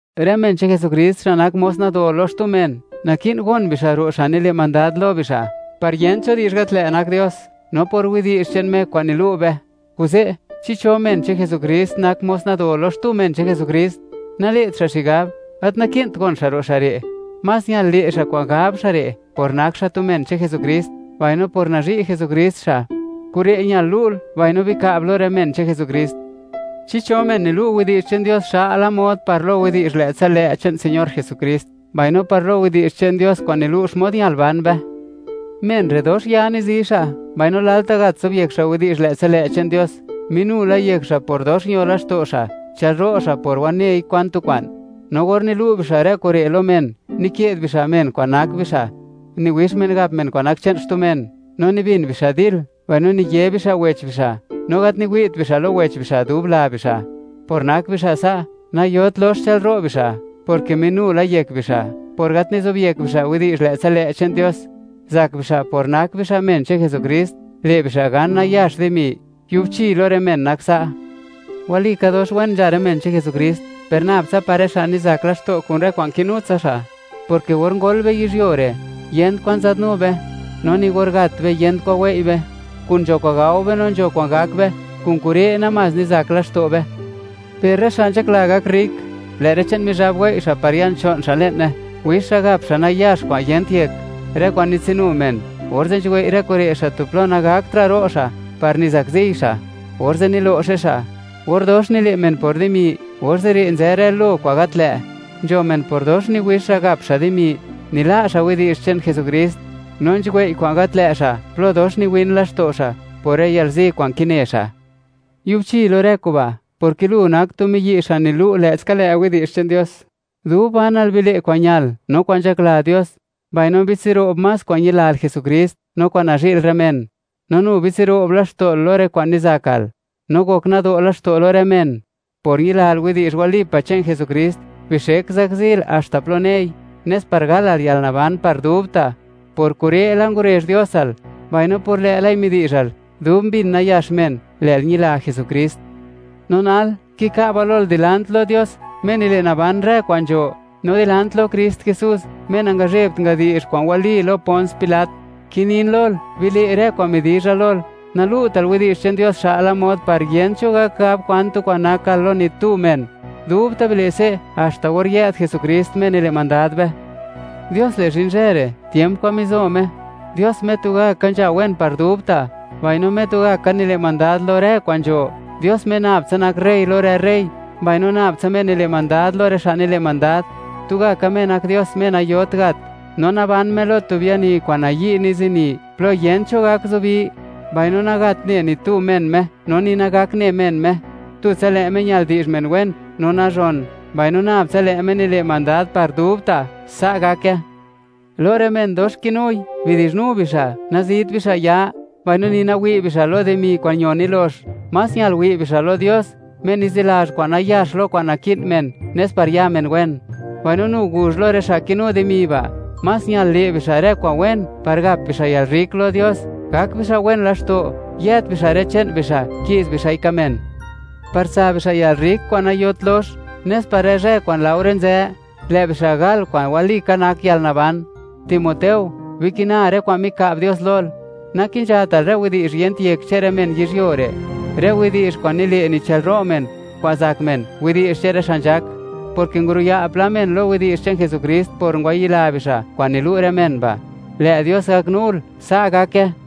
Rë men che'n Jesukrist xa' nak mos nado lo xtu men, naki'n gon bixa' ro' xa' nile' mandad lo bixa', par yent cho di'zh gat lë' nak Dios, no por widi'zh che'n Me kwa'n nilu' be. Kuze', chi cho men che'n Jesukrist nak mos nado lo xtu men che'n Jesukrist, nale't xa' xigab, gat naki'nt gon xa' ro' xa' re'; más ñal le' xa' kwa'n gab xa' re' por nak xa' tu men che'n Jesukrist, mbaino por nazhi' Jesukrist xa'. Kure' ñal lu'l mbaino bika'b lo rë men che'n Jesukrist. Chi cho men nilu' widi'zh che'n Dios xa'la mod par lo widi'zh lë'tsa lë' che'n Señor Jesukrist, mbaino par lo widi'zh che'n Dios kwa'n nilu' xmod ñal ban be. Men re' dox ya nizi xa', mbaino lalta' gat zobyek xa' widi'zh lë'tsa lë' che'n Dios. Minu la yek xa' por dox ño laxto' xa', chë'lro' xa' por wanei kwan tu kwa'n. No or nilu' bixa' rë kure' lo men, nike'd bixa'y men kwa'n nak bixa'; niwix men gap men kwa'n nak che'n xtu men, no nibin bixa' dil, mbaino niye bixa' wech bixa', no gat niwi't bixa' lo wech bixa' dub la bixa'. Por nak bixa' sa', nayot lox chë'lro' bixa', porke minu la yek bixa' por gat nizobyek bixa' widi'zh lë'tsa lë' che'n Dios; zak bixa', por nak bixa' men che'n Jesukrist, le' bixa' gan nayax dimi. Yubchi lo rë men nak sa'. Walika, dox wen nzha rë men che'n Jesukrist, per nab tsa par rë xa' nizak laxto' kun rë kwa'n kinu tsa xa', porke or ngol be yizhyuo re', yent kwan nzadnu be; no ni or gat be, yent kwa'n wei' be; kun nzho kwa'n gao be, no nzho kwa'n gak be; kun kure' namás nizak laxto' be. Per rë xa' nzhakla gak rrik, lë' rë che'n Mizhab wei' xa' par ya'n cho'n xa' le'ne; wix xa' gap xa' nayax kwa'n yent yek, rë kwa'n nitsinu men; orze' nzhuwei' rë kure' xa' tu plo nagaktra' ro' xa' par nizakziy xa', orze' nilo'xe xa'. Or dox nile' men por dimi, orze' re' nzë rë lo kwa'n gat lë'; nzho men, por dox niwix xa' gap xa' dimi, nila' xa' widi'zh che'n Jesukrist, no nzhuwei' kwa'n gat lë' xa' plo dox niwin laxto' xa' por rë yalzi kwa'n kine xa'. Yubchi lo rë kuba', porke lu, nak tu miyi' xa' nilu' lë'ska lë' widi'zh che'n Dios; dub banal bile' kwa'n ñal no kwa'n nzhakla Dios; mbaino bitsiro'b más kwa'n ñilal Jesukrist no kwa'n nazhi'l rë men; no nu bitsiro'b laxto'l lo rë kwa'n nizakal, no gok nado' laxto' lo rë men. Por ñilal widi'zh walipa' che'n Jesukrist, bixek zakzil haxta plo nei; nes par galal yalnaban par dubta'. Por kure' la ngurezh Diosal, mbaino por lë'lai midi'zhal, dub mbin nayax men, lë'l ñila Jesukrist. No nal, kika'ba lol, dilant lo Dios, Me nile' naban rë kwa'n nzho; no dilant lo Krist Jesús, Me nangazhebt ngadi'zh kwa'n wali lo Pons Pilat; kinin lol, bile' rë kwa'n midi'zha lol; nalu'tal widi'zh che'n Dios xa'la mod par yent cho gak gab kwan tu kwa'n nakal lo ni tu men; dubta' bile' se' haxta or yë'd Jesukrist, Me nile' mandad be. Dios le' zhin zhë re', tiemp kwa'n mizo Me; Dios Me tugaka nzha wen par dubta', mbaino Me tugaka nile' mandad lo rë kwa'n nzho; Dios Me nab tsa nak rey lo rë rey, mbaino nab tsa Me nile' mandad lo rë xa' nile' mandad. Tugaka Me nak Dios Me nayot gat, no naban Me lo tu biani kwa'n nayi' nizini, plo yent cho gak zubi; mbaino nagat ne ni tu men Me, no ni nagak ne men Me. Tutsa lë' Me ñal di'zh men wen no nazhon, mbaino nab tsa lë' Me nile' mandad par dubta'. Sa' gake. Lo rë men dox kinui, bidi'zhnu bixa', nazit bixa' ya, mbaino ni nawi' bixa' lo dimi kwa'n ño nilox. Más ñal wi' bixa' lo Dios, Me nizilazh kwa'n nayax lo kwa'n naki'n men nes par ya men wen. Mbaino nu guzh lo rë xa' kinu dimi ba', más ñal le' bixa' rë kwa'n wen par gap bixa' yalrrik lo Dios; gak bixa' wen laxto', yëët bixa' rë che'n bixa', ki'z bixa'i ka' men, par tsa bixa' yalrrik kwa'n nayot lox, nes par rë zhë kwa'n laore nzë, lë' bixa' gal kwa'n walika nak yalnaban. Timoteo, bikina rë kwa'n mika'b Dios lol; nakinzhatal rë widi'zh yent yek che'n rë men yizhyuo re', rë widi'zh kwa'n nile' nichëlro' men, kwa'n zak men, widi'zh che'n rë xa' nzhak, porke nguruya' pla men lo widi'zh che'n Jesukrist por ngwayila bixa' kwa'n nilu' rë men ba'. Lë' Dios gaknul. Sa' gake.